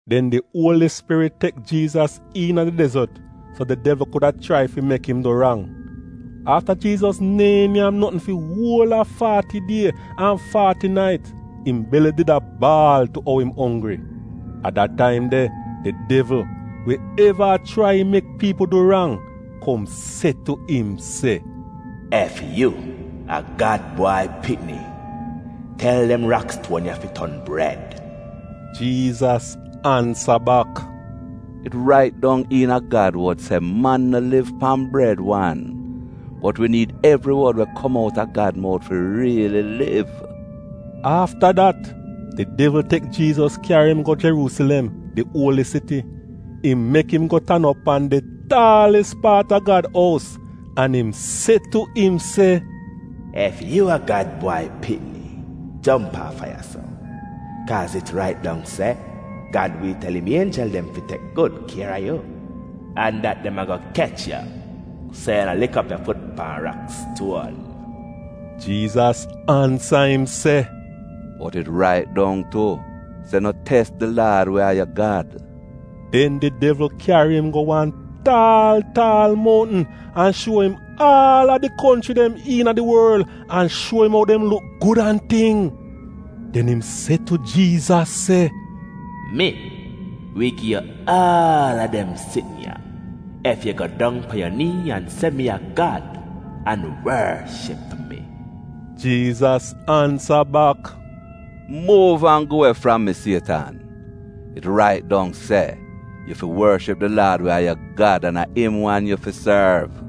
Den di Uoli Spirit tek Jiizas iina di dezot so di devl kuda chrai fi mek im du rang. Afta Jiizas neehn nyam notn fi uol a faati die an faati nait, im beli did a baal tu ou im onggri. A da taim de di devl, we eva a chrai mek piipl du rang, kom se tu im se, “Ef yu a Gad Bwai Pikni, tel dem rakstuon ya fi ton bred.” Jiizas ansa bak, “It rait dong iina Gad wod se, ‘Man no liv pan bred wan. Bot wi niid evri wod we kom out a Gad mout fi riili liv.” Afta dat, di devl tek Jiizas kyari im go Jeruusilem, di uoli siti. Im mek im go tan op pan di taalis paat a Gad ous, an im se tu im se, “Ef yu a Gad Bwai Pikni, jomp aafa ya-so. Kaaz it rait dong se, ‘Gad wi tel im ienjel dem fi tek gud kier a yu,’ an dat ‘Dem ago kech yu, so yu no lik op yu fut pan rakstuon.’” Jiizas ansa im se, “Bot it rait dong tu, se ‘No tes di Laad we a yu Gad.’” Den di devl kyari im go wan taal taal mountn an shuo im aal a di konchri dem iina di worl an shuo im ou dem luk gud an ting. Den im se tu Jiizas se, “Mi wi gi yu aal a dem sitn ya ef yu go dong pan yu nii an se mi a Gad, an worship mi.” Jiizas ansa bak, “Muuv an gu we fram mi Sietan! It rait dong se, ‘Yu fi worship di Laad we a yu Gad, an a im wan yu fi sorv.’”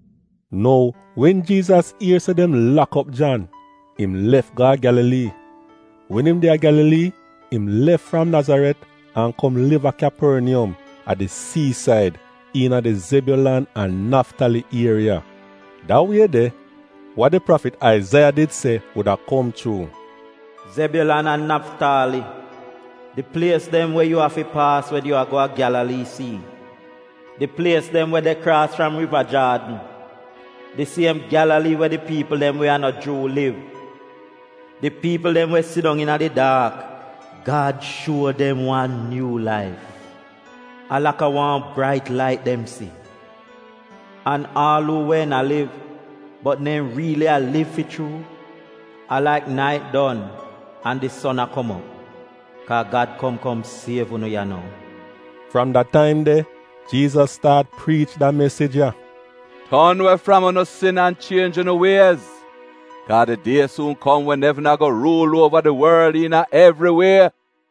Nou wen Jiizas ier se dem lak op Jan, im lef go a Gyalalii. Wen im de a Gyalalii, im lef fram Nazaret an kom liv a Kyaporniyom, a di siisaid, iina di Zebyulan an Naftali ieriya, da wie de, wa di prafit Aizaiya did se wuda kom chuu: “Zebyulan an Naftali, di plies dem we yu afi paas wen yaa go a Gyalalii sii, di plies dem we de kraas fram Riva Jaadn, di siem Gyalalii we di piipl dem we a no Juu liv - di piipl dem we sidong iina di daak Gad shuo dem wan nyuu laif — a laka wan brait lait dem si. An aal uu wehn a liv, bot neehn riili a liv fi chuu, a laik nait don an di son a kom op, kaa Gad kom kom siev unu ya nou.” Fram da taim de, Jiizas staat priich da mesij ya: “Ton we fram unu sin an chienj unu wiez, kaa di die suun kom wen evn ago ruul uova di worl iina evri wie!”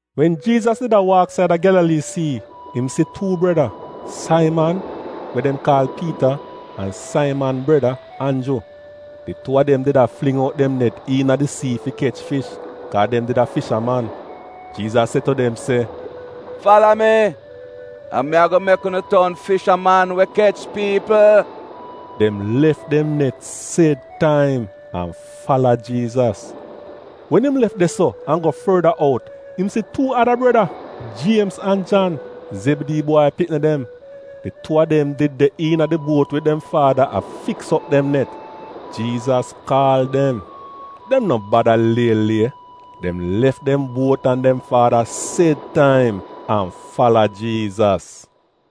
Wen Jiizas did a waak saida Gyalalii sii, im si tuu breda: Saiman, we dem kaal Piita, an Saiman breda, Anju. Di tuu a dem did a fling out dem net iina di sii fi kech fish, kaa dem did a fishaman. Jiizas se tu dem se, “Fala mi, an mi ago mek unu ton fishaman we kech piipl.” Dem lef dem net sed taim an fala Jiizas. Wen im lef de-so an go forda out im si tuu ada breda: Jiemz an Jan — Zebidii bwai pikni dem. Di tuu a dem did de iina di buot wid dem faada a fiks op dem net. Jiizas kaal dem. Dem no bada lie-lie, dem lef dem buot an dem faada sed taim, an fala Jiizas.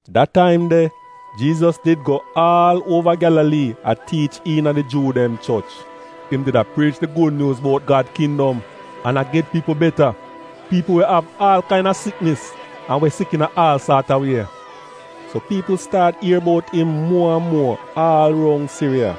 Da taim de, Jiizas did go aal uova Gyalalii a tiich iina di Juu dem choch. Im did a priich di gud nyuuz bout Gad kindom an a get piipl beta — piipl we av aal kaina siknis an we sik iina aal saat a wie. So piipl staat ier bout im muo an muo aal roun Siriya,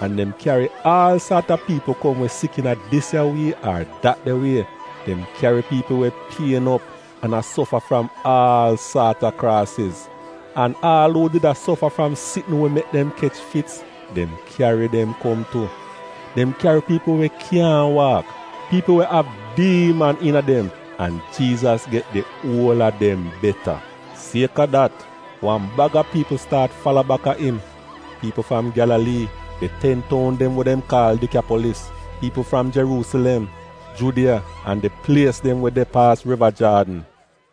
an dem kyari aal saat a piipl kom we sik iina dis ya wie ar dat de wie. Dem kyari piipl we pien op an a sofa fram aal saat a kraasiz, an aal uu did a sofa fram sitn we mek dem kech fits dem kyari dem kom tu. Dem kyari piipl we kyaahn waak, piipl we av diiman iina dem, an Jiizas get di uol a dem beta. Sieka dat, wan baga piipl staat fala baka im: piipl fram Gyalalii, di ten toun dem we dem kaal Dikyapolis, piipl fram Jeruusilem, Judiya an di plies dem we de paas Riva Jaadn.